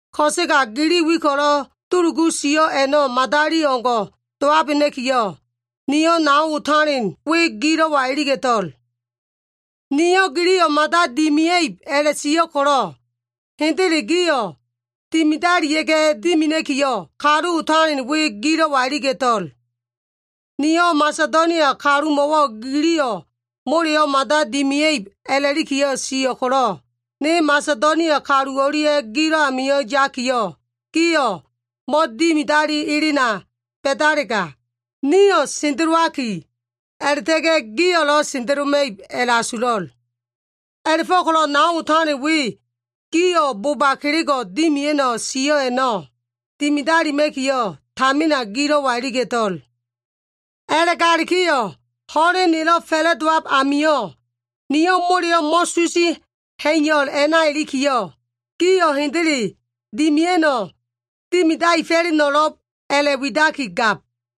Ko꞉sega gili wi ko꞉lo꞉ dulugu sio꞉ a꞉no꞉ madali o꞉ngo꞉ dowabena꞉kiyo꞉, niyo꞉ nao otalen we gilo꞉wa iliga꞉to꞉l. Niyo꞉ giliyo꞉ mada dimia꞉ib a꞉la꞉sio꞉ ko꞉lo꞉, hendele gio꞉ dimidalia꞉ga꞉ dimina꞉kiyo꞉, kalu otalen we gilo꞉wa iliga꞉to꞉l. Niyo꞉ Masedonia kalumo꞉wo꞉ giliyo꞉ moleyo꞉ mada dimia꞉ib a꞉la꞉liki sio꞉ ko꞉lo꞉, ne Masedonia kalu o꞉lia꞉ gilo꞉ amio꞉ yakiyo꞉, gio꞉ mo꞉dimidali elena ba꞉dalega, nio꞉ sendelowaki, a꞉la꞉ta꞉ga꞉ gio꞉lo꞉ sendeloma꞉ib a꞉la꞉asulo꞉l. A꞉la꞉fo꞉ko꞉lo꞉ nao otalen we gio꞉ boba kelego꞉ dimia꞉no꞉ sio꞉ a꞉no꞉ dimidalima꞉kiyo꞉ tamina gilo꞉wa iliga꞉to꞉l. A꞉la꞉galikiyo꞉ ho꞉len nelo꞉ fa꞉la꞉dowab amio꞉, niyo꞉ moleyo꞉ mo꞉susi ha꞉iyo꞉l a꞉na ilikiyo꞉, gio꞉ hendele dimia꞉no꞉ dimidaefo꞉leno꞉lo꞉b a꞉la꞉widaki gab.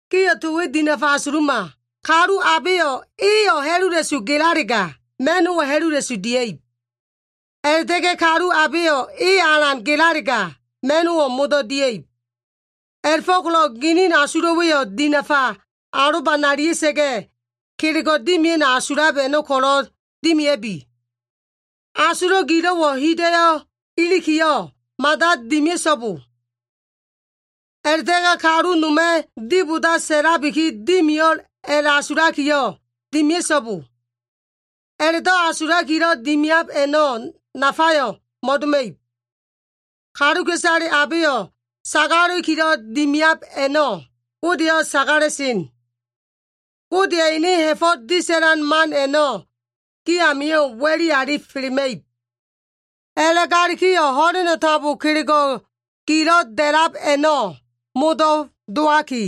Gio꞉ to we dinafa asuluma. Kalu abeyo꞉ eyo꞉ ha꞉lula꞉su gelalega, ma꞉no꞉wo꞉ ha꞉lula꞉su dia꞉ib. A꞉la꞉ta꞉ga꞉ kalu abeyo꞉ eyo꞉ alan gelalega, ma꞉no꞉wo꞉ modo꞉ dia꞉ib. A꞉la꞉fo꞉ko꞉lo꞉ ginin asulo꞉wa꞉yo꞉ dinafa alobanalia꞉sa꞉ga꞉, kelego꞉ dimia꞉no꞉ asulab a꞉no꞉ ko꞉lo꞉ dimia꞉bi. Asulo꞉ gilo꞉wo꞉ hida꞉yo꞉ ilikiyo꞉ mada dimia꞉so꞉bo. A꞉la꞉ta꞉ga꞉ kalu noma꞉ diboda sa꞉labiki dimio꞉l a꞉la꞉asulakiyo꞉ dimia꞉so꞉bo. A꞉la꞉do꞉ asulakilo꞉ dimiab a꞉no꞉ nafayo꞉ mo꞉doma꞉ib. Kaluka꞉isale abeyo꞉ sagala꞉likilo꞉ dimiab a꞉no꞉ Godeyo꞉ sagala꞉sen. Godeya꞉ ene ha꞉fo꞉ disa꞉lan man a꞉no꞉ gi amio꞉ wa꞉li alifelema꞉ib. A꞉la꞉galikiyo꞉ ho꞉leno꞉ tambo kelego꞉ gilo꞉ da꞉lab a꞉no꞉ modo꞉ dowaki,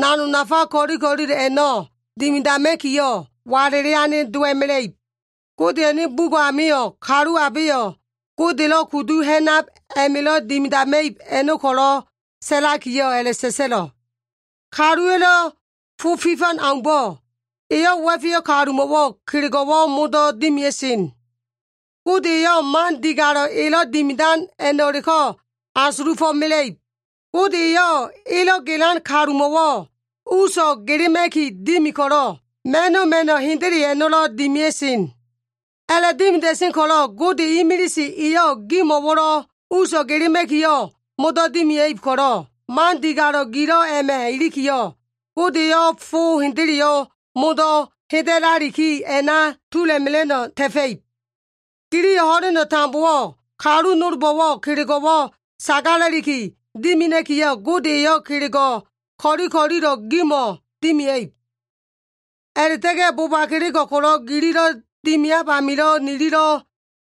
nanog nafa ko꞉li ko꞉lilo꞉ a꞉no꞉ dimidama꞉kiyo꞉, walele ane dowa꞉mela꞉ib. Godeya꞉ ene bugo꞉ amio꞉ kalu abeyo꞉ Godelo꞉ kudu ha꞉nab a꞉ma꞉lo꞉ dimidama꞉ib a꞉no꞉ ko꞉lo꞉ sa꞉lakiyo꞉ a꞉la꞉sa꞉sa꞉lo꞉, “Kaluwa꞉lo꞉ fo fifan aumbo꞉, eyo꞉ wa꞉feyo꞉ kalumo꞉wo꞉ kelego꞉wo꞉ modo꞉ dimia꞉sen. Gode eyo꞉ man digalo꞉ elo꞉ dimidan a꞉no꞉leko꞉ asulufo꞉ mela꞉ib.” Gode eyo꞉ elo꞉ gelan kalumo꞉wo꞉ uso꞉ gelema꞉ki dimi ko꞉lo꞉, ma꞉no꞉ ma꞉no꞉ hendele a꞉no꞉lo꞉ dimia꞉sen. A꞉la꞉dimida꞉sen ko꞉lo꞉, Gode imilise eyo꞉ gimo꞉wo꞉lo꞉ uso꞉ gelema꞉kiyo꞉ modo꞉ dimia꞉ib ko꞉lo꞉, man digalo꞉ gilo꞉ a꞉ma꞉ ilikiyo꞉, Gode eyo꞉ fo hendeleyo꞉ modo꞉ heda꞉laliki a꞉na tula꞉mela꞉no꞉ ta꞉fa꞉ib. Giliyo꞉ ho꞉leno꞉ tambowo꞉ kalu nolbo꞉wo꞉ kelego꞉wo꞉ sagala꞉liki dimina꞉kiyo꞉, Gode eyo꞉ kelego꞉ ko꞉li ko꞉lilo꞉ a꞉no꞉ gimo꞉ dimia꞉ib. A꞉la꞉ta꞉ga꞉ boba kelego꞉ ko꞉lo꞉ gililo꞉ dimiab amilo꞉ nililo꞉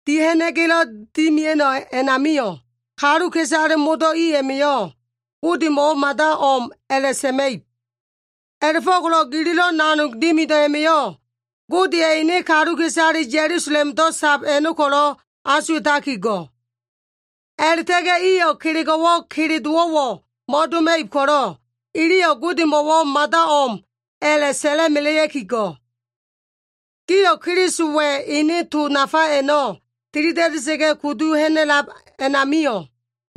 dia꞉ha꞉na꞉ga꞉lo꞉ dimia꞉no꞉ a꞉namio꞉, kaluka꞉isale modo꞉ i a꞉ma꞉yo꞉ Godemo꞉wo꞉ mada o꞉m a꞉la꞉sa꞉ma꞉ib. A꞉la꞉fo꞉ko꞉lo꞉ gililo꞉ nanog dimido꞉ a꞉ma꞉yo꞉, Godeya꞉ ene kaluka꞉isale Ya꞉lusalemdo꞉ sab a꞉no꞉ ko꞉lo꞉ asuwa꞉taki go꞉. A꞉la꞉ta꞉ga꞉ iyo꞉ kelego꞉wo꞉ kele dowo꞉wo꞉ mo꞉doma꞉ib ko꞉lo꞉, iliyo꞉ Godemo꞉wo꞉ mada o꞉m a꞉la꞉ sa꞉la꞉melea꞉ki go꞉. Gio꞉ Kelisowa꞉ ene to nafa a꞉no꞉ tilida꞉da꞉sa꞉ga꞉ kudu ha꞉na꞉lab a꞉namio꞉,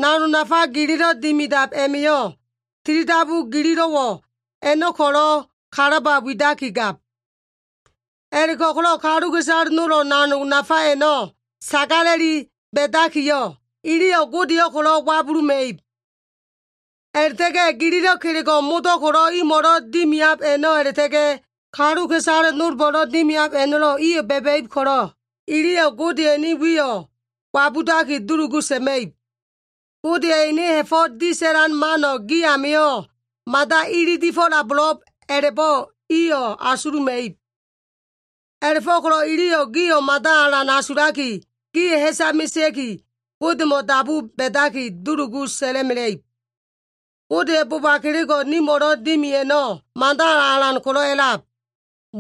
nanog nafa gililo꞉ dimidab a꞉ma꞉yo꞉, tilidabu gililo꞉ a꞉no꞉ ko꞉lo꞉ kalaba widaki gab. A꞉la꞉go꞉ko꞉lo꞉ kaluka꞉isale nolba꞉yo꞉ nanog gilo꞉ a꞉no꞉ nafale ba꞉dakiyo꞉, iliyo꞉ Godeyo꞉ ko꞉lo꞉ wabuluma꞉ib. A꞉la꞉ta꞉ga꞉ gililo꞉ kelego꞉ modo꞉ ko꞉lo꞉ imo꞉lo꞉ dimiab a꞉no꞉ a꞉la꞉ta꞉ga꞉, kaluka꞉isale nolbo꞉lo꞉ dimiab a꞉no꞉lo꞉, iyo꞉ ba꞉ba꞉ib ko꞉lo꞉, iliyo꞉ Godeya꞉ ene wiyo꞉ wabudaki dulugu sa꞉ma꞉ib. Godeya꞉ ene ha꞉fo꞉ disa꞉lan mano꞉ gi amio꞉ mada ililifo꞉labo꞉lo꞉b a꞉la꞉bo꞉ iyo꞉ asuluma꞉ib. A꞉la꞉fo꞉ko꞉lo꞉ iliyo꞉ gio꞉ mada alan asulaki, gio꞉ ha꞉sa mesea꞉ki, Godemo꞉ dabu ba꞉daki, dulugu sa꞉la꞉mela꞉ib. Godeya꞉ boba kelego꞉ nimo꞉lo꞉ dimi a꞉no꞉, mada alan ko꞉lo꞉ a꞉lab.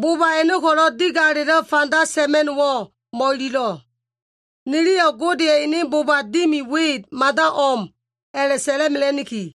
Bo꞉ba a꞉no꞉ ko꞉lo꞉ digalelo꞉ fanda sa꞉ma꞉no꞉wo꞉ mo꞉ililo꞉. Niliyo꞉ Godeya꞉ ene boba dimi we mada o꞉m a꞉la꞉sa꞉la꞉mela꞉niki.